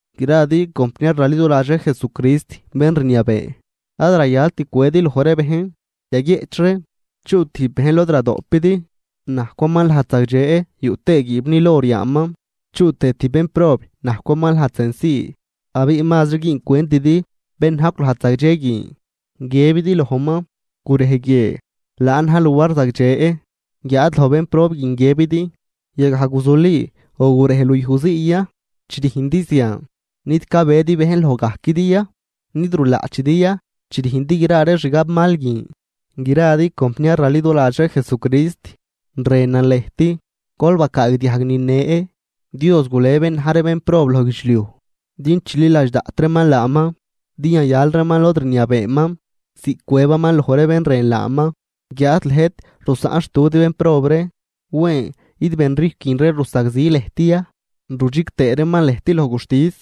Gradi compniar raliduladx ree Jesucrist bén rniabee, ad rayalt cwedi loj ree bejn. Yaguieꞌch ree, chuꞌ tijb bejn lod radoꞌpidi, najcwaman lajd zagdxe yuꞌ tëë guiibnil or yaaman, chuꞌ tëë tijb bénprob najcwaman lajd senci, abiꞌ mazri güüncwentidi bén najcw lajd zagdxe guin, guiëbidi lojman: “Gurej guie, laan na̱j luar zagdxe”, guiáad loj bénprob guin guiëbidi: “Yagaj guzuli o gurej luyuj zii ya.” Chi rüjndi zian, ¿nid cabedi bejn loj gajquidi ya?, ¿nid rulaꞌchidi ya chi rüjndi gra ree xgabmal guin? Gradi compniar raliduladx ree Jesucrist, rënan lëjt, gol bacaagdiajg nine: Dios gule bén na̱j ree bénprob loj guidxliuj din chililadx daꞌt reeman laaman, din yayal reeman lod rniabeeman ziꞌc cwëbaman loj ree bén rën laaman. Guiáad lëjt rusaꞌn xtudi bénprob ree. Wen, ¿id benrijcw guin ree rusagzi lëjt ya rudxig tëë reeman lëjt loj guxtis?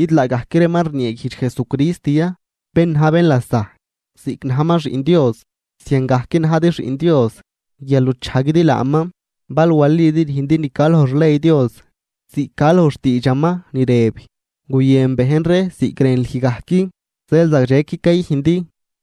¿Id laagajc reeman rnieeguijdx Jesucrist ya, bén na̱j bénlasajc? Ziꞌc najman Xiꞌn Dios, ziangajc najdi xiꞌn Dios, guial nuchajguidi laaman. Bal walidi rüjndi ni ca loj xley Dios, ziꞌc ca loj xtiidxaman ni rëb: “Guyën bejn ree ziꞌc rën lüj gajc”, dxel zagdxequi cayüjndi.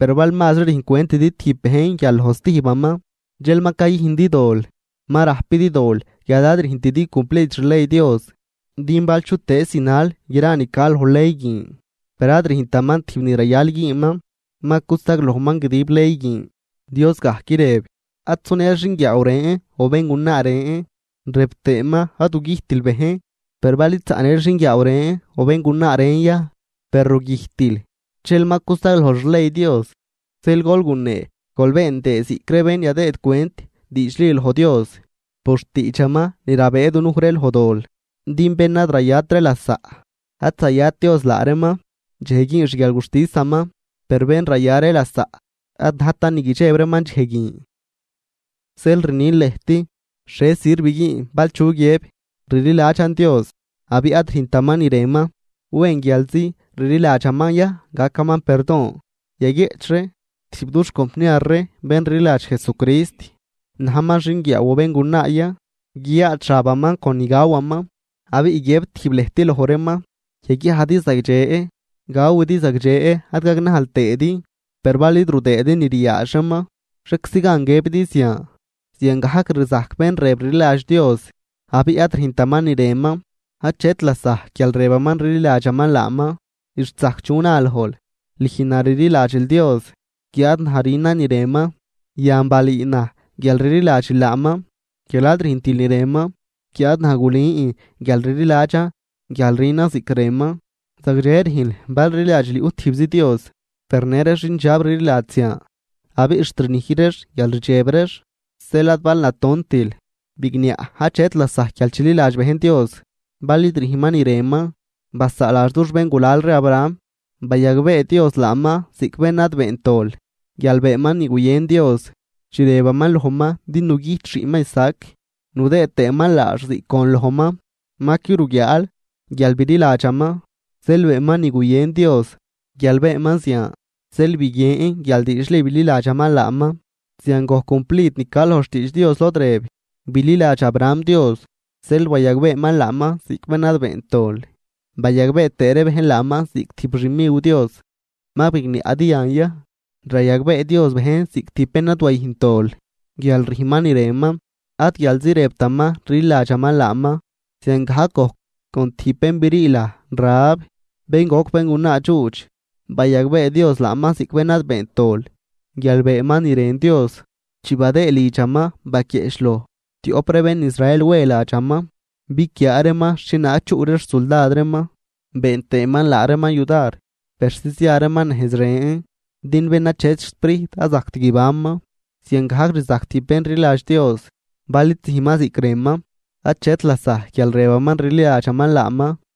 Per bal mazri rüjncwentidi tijb bejn guial loj stijbaman, dxel ma cayüjndi dol, ma rajpidi dol guial ad rüjntidi cumplid xley Dios. Din bal chutëëz zinal gra ni ca loj ley guin per ad rüjntaman tijb ni rayal güünman, ma cusaglojman guidib ley guin. Dios gajc rëb: “Ad sunël xinguiaaw ren o béngunaa ren”, rëb tëëman: “Ad gugüjtil bejn.” Per bal id zaꞌnël xinguiaaw o béngunaa ren ya per rugüjtil, dxel ma cusaglojl xley Dios. Zeel gol gunee gol been tëë ziꞌc ree bén yadëëd cwent diidxli loj Dios por xtiidxaman ni rabëë dunuj ree loj dol. Din bén ad rayat ree lasaꞌ, ad zayat Dios laa reeman dxej güün xguialguxtisaman. Per bén raya ree lasaꞌ ad najtan ni guidxeb reeman dxej guin. Zeel rnin lëjt, ¿xhie sirv güün bal chu guiëb, rliladxan Dios, abiꞌ ad rüjntaman ni rënman? ¿Wen, guialzi rliladxaman ya gacaman perdon? Yaguieꞌch ree, tijb dux compniar ree, bén rliladx Jesucrist, najman xinguiaaw o béngunaa ya, guiyaadx xabaman con ni gawaman, abiꞌ guiëb tijb lëjt loj reeman: “Yaguiajdi zagdxe, gawidi zagdxe ad gagnajl tëëdi.” Per bal id rudëëdi ni riaadx reeman, ¿xhieczi gan guiëbidi zian? Ziangajc rzajc bén rëb rliladx Dios abiꞌ ad rüjntaman ni rënman, achet lasajc guial rëbaman rliladxaman laaman. Xt zajc chu na lojl: “Lüj na rliladxil Dios, guiáad naj rünan ni rënman.” Yan balüü naj guial rliladxil laaman guial ad rüjntil ni rënman, guiáad naj gulün guial rliladxan guial rünan ziꞌc rënman. Zagdxe rüjnl bal rliladxil yuꞌ tijbzi Dios, per në ree xindxab rliladx zian, abiꞌ xt rnij reex guial rdxeb reex. Zeel ad bal natontil, bigniaꞌ achet lasajc guial chililadx bejn Dios bal id rüjnman ni rënman. Basaaladx, dux béngulal ree Abraham, bayagbee Dios laaman ziꞌc bén ad beent dol, guial beenman ni guyën Dios, chi rëbaman lojman din nugüjt xiꞌnman Isaac nudëë tëëman laax ziꞌc gon lojman. Ma qui ruguiaal, guial bililadxaman, zeel beenman ni guyën Dios. Guial beenman zian, zeel biguien guial diidxli bililadxaman laaman. Zian gojc cumplid ni ca loj xtiidx Dios, lod rëb: “Bililadx Abraham Dios, zeel bayagbeeman laaman ziꞌc bén ad beent dol”, bayagbee tëë ree bejn laaman ziꞌc tijb xmiw Dios. ¿Ma bigniaꞌdi yan ya? Rayagbee Dios bejn ziꞌc tijb bén ad wayüjnt dol guial rüjnman ni rënman, ad guialzi rëbtaman rliladxaman laaman. Ziangajc gojc con tijb bén brii laj Rahab, bén goc béngunaa dxuudx, bayagbee Dios laaman ziꞌc bén ad beent dol guial beenman ni rën Dios, chi badëëd lidxaman baquieꞌchloj tioꞌp ree bén Israel we ladxaman biquiaa reeman xhienaag chuꞌ ree xsuldad reeman, been tëëman laa reeman yudar persi zia reeman nejz ren. Din bén achet xsprijt ad zajct guibanman. Ziangajc rzajc tijb bén rliladx Dios: bal id züjnman ziꞌc rënman, achet lasajc guial rëbaman rliladxaman laaman.